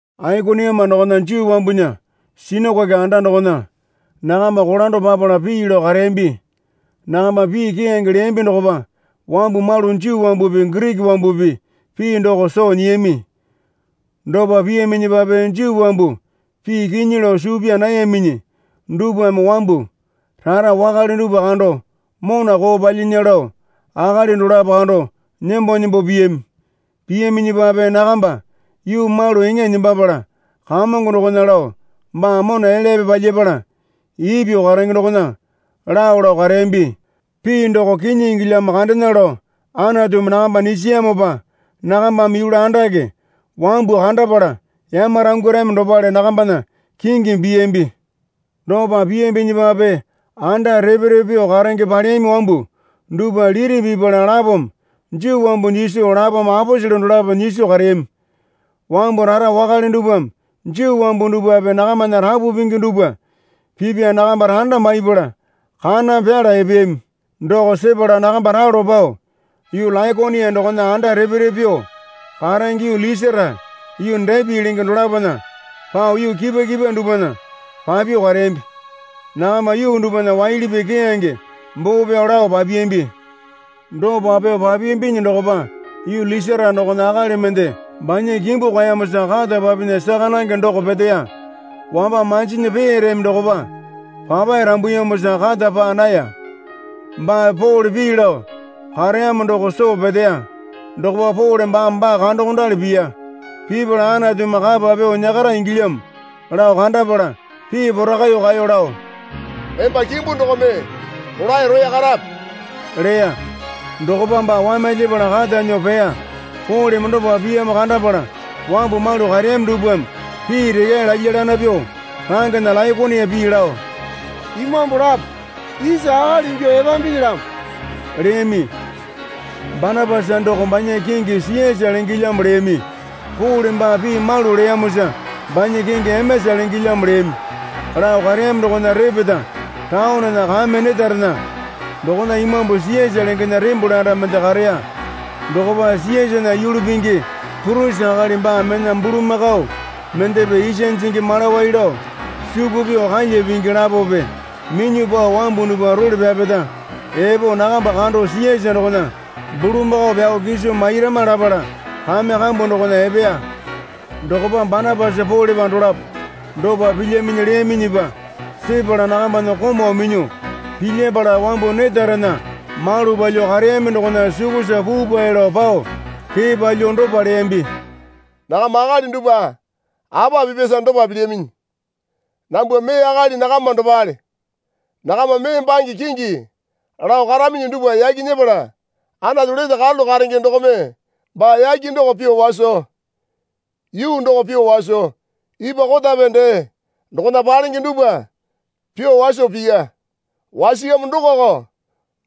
Aikoniuma dokona Juu wambunya sinakoke anda dokona nakamba kolando papala pii lao kareyambi. Nakamba pii keyange leyambi dokopa wambu malu Juu wambupi Giriki wambupi pii doko soo nyiyami. Dopa piyaminyipape Juu wambu pii kinyi lao suu pyaa nayaminyi dupwame wambu rara wakale dupwa kando mona koo palyinya lao akali dolapo kando nembo nembo piyami. Piyaminyipape nakamba yuu malu eŋa nembapala Kamongo dokona lao baa mona elyape palyapala ipyuo karenge dokona lao lao kareyambi. Pii doko kinyi ingilyamo kandena lao Anatumi nakamba nyisiyamopa nakambame yulu andake wambu kandapala yamarangwarami dopale nakambana kingimi piyambi. Dopa piyambinyipape anda repe repe pyuo karenge paleyami wambu dupwa liti pipala lapome Juu wambu nyiso lapome aposele dolapo nyiso kareyami. Wambu rara wakale dupwame Juu wambu dupwape nakamana rapu pingi dupwa pipya nakamba randa maipala kaname pyala epeyami. Doko sepala nakamba ralo pao yuu Laikonia dokona anda repe repe pyuo karenge yuu Lisara yuu Depi lenge dolapona pao yuu kipwa kipwa dupwana papyuo kareyambi. Nakamba yuu dupwana waili pii keyange boo pyao lao papiyambi. Dopa pyuo papiyambinyi dokopa yuu Lisara dokona akali mende banya kimbu kwaeyamosa kata papinya saka nange doko peteya. Wamba manjinyi peyareyami dokopa papae rambuyamosa kata paa naya. Baa Pole pii lao kareyamo doko soo peteya. Dokopa Pole baame baa kandokondali piya. Pipala Anatumi kapa pyuo nyakara ingilyamo lao kandapala pii porakaiyuo kaeyo lao, Emba kimbu dokome rolae roya karape leya. Dokopa baa wamyalyapala kata nyuo peya. Poleme dopa piyamo kandapala wambu malu kareyami dupwame pii rekyae lalya lana pyuo rangena Laikonia pii lao, Imambu lapo isa akali ingyuo epambinyilamo leyami. Banapasa doko banya kingi Siyasa lengelyamo leyami. Pole baa pii malu leyamosa banya kingi Emesa lengelyamo leyami. Lao kareyami dokona repeta taonena kame netarena dokona imambu Siyasa lengena tembole anda mende kareya. Dokopa Siyasana yulu pingi purisi akali baa mena bulamakao mendepe isa jingi malawai lao suku pyuo kalya pingi lapope minyuo pao wambu dupwa role pyapeta epo nakamba kando Siyasa dokona bulamakao pyao kiso mairama lapala kame kambu dokona epeya. Dokopa Banapasa Polepa dolapo dopa pilyaminyi leyaminyipa sepala nakambana komau minyuo pilyapala wambu netarena malu palyuo kareyami dokona sukusa puupae lao pao kee palyuo dopa leyambi. Nakama akali dupwa apa pipyasa dopa pilyaminyi? Nambwa mee akali nakama dopale. Nakama mee bange kingi lao karaminyi dupwa yaki nyepala Anatu lete karalu karenge dokome baa yake doko pyuo waso yuu doko pyuo waso ipwa kotape dee dokona palenge dupwa pyuo waso piya. Wasiyamo dokoko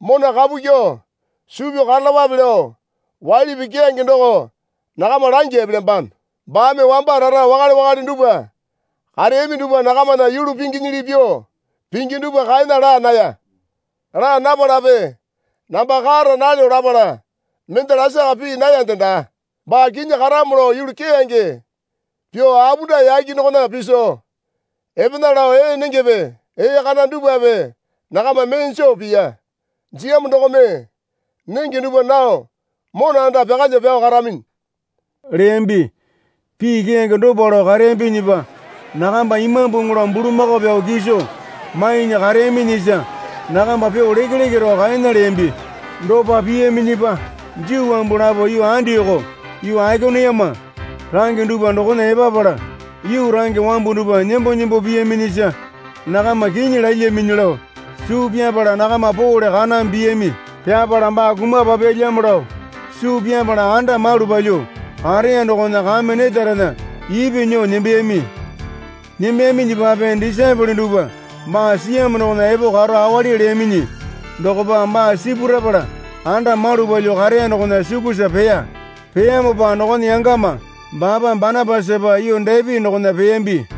mona kapu kyuo suu pyao karalapape lao waili pii keyange doko nakama langya epelyambano. Baame wamba rara wakale wakale dupwa kareyami dupwa nakamana yulu pinginyili pyuo pingi dupwa kaena laa naya. Laa napalape namba kara nalyo lapala mende lasaka pii nayande daa. Baa kinyi karamo lao yulu keyange pyuo apunda yake dokona piso epena lao ee nengepe ee kana dupwape nakama mee joo piya. Jiyamo dokome nenge dupwa nao mona anda pyakalyuo pyao karaminyi leyambi. Pii keyange dopa lao kareyambinyipa nakamba imambuŋu lao bulamakao pyao kiso mainya kareyaminyisa nakamba pyuo lekeleke rao kaena leyambi. Dopa piyaminyipa Juu wambu lapo yuu Andioko yuu Aikoniuma range dupwa dokona epapala yuu range wambu dupwa nembo nembo piyaminyisa nakama kinyi lalyaminyi lao suu pyapala nakama Pole kaname piyami. Pyapala baa kumapapyalyamo lao suu pyapala anda malu palyuo kareya dokona kame netarena ipyuo nyuo nembeyami. Nembeyaminyipape disaepole dupwa baa siyamo dokona epo karo awali leyaminyi dokopa baa sipurapala anda malu palyuo kareya dokona sukusa peya. Peyamopa dokona yangama baapa Banapasapa yuu Depi dokona peyambi.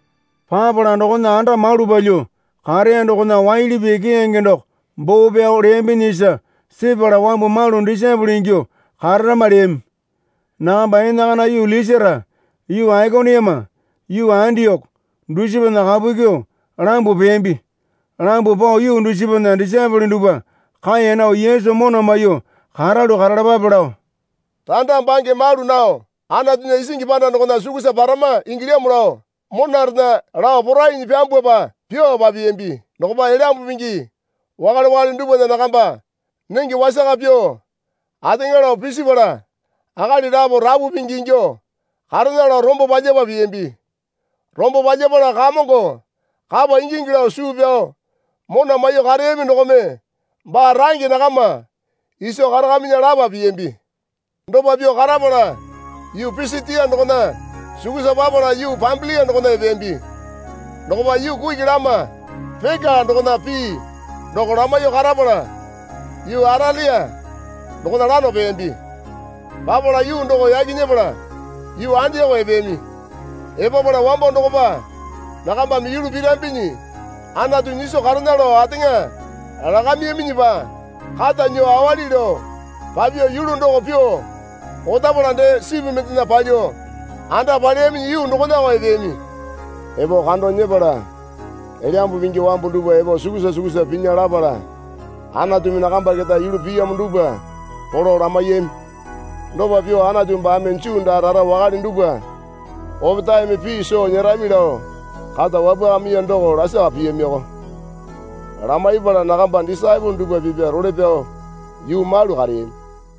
Papala dokona anda malu palyuo kareya dokona waili pii keyange doko boo pyao leyambinyisa sepala wambu malu disaepole ingyuo kararama leyami. Nakamba enakana yuu Lisara yuu Aikoniuma yuu Andioko dusipana kapu kyuo lambuo peyambi. Lambuo pao yuu dusipana disaepole dupwa kaeya nao Yesu mona maiyuo karalu karalapape lao, Randa bange malu nao Anatunya isingi panda dokona sukusa parama ingilyamo lao, monarena lao porainyi pyambwapa pyuo papiyambi. Dokopa Elyambu Pingi wakale wakale dupwana nakamba nenge wasaka pyuo ateŋa lao pisipala akali lapo rapu pingi inyuo karena lao rombo palyapa piyambi. Rombo palyapala Kamongo kapa ingingi lao suu pyao mona maiyuo kareyami dokome baa range nakama iso karakaminya lapa piyambi. Dopa pyuo karapala yuu Pisitia dokona sukusa papala yuu Pambilia dokona epeyambi. Dokopa yuu kuki lama Peka dokona pii doko lamaiyuo karapala yuu Atelia dokona lano peyambi. Papala yuu doko yaki nyepala yuu Andioko epeyami. Epapala wambo dokopa nakambame yulu pirambinyi Anatu nyiso karena lao ateŋa lakamiyaminyipa kata nyuo awali lao papyuo yulu doko pyuo otapala dee sipu mendena palyuo anda paleyami yuu dokonako epeyami. Epo kando nyepala Elyambu Pingi wambu dupwa epo sukusa sukusa pinya lapala Anatumi nakamba keta yulu piyamo dupwa polo lamaiyami. Dopa pyuo Anatu baame Juu daa rara wakale dupwa opetaeme pii soo nyerami lao kata wapwakamiya doko lasaka piyamiko. Lamaipala nakamba disaepole dupwa pipya role pyao yuu malu kareyami.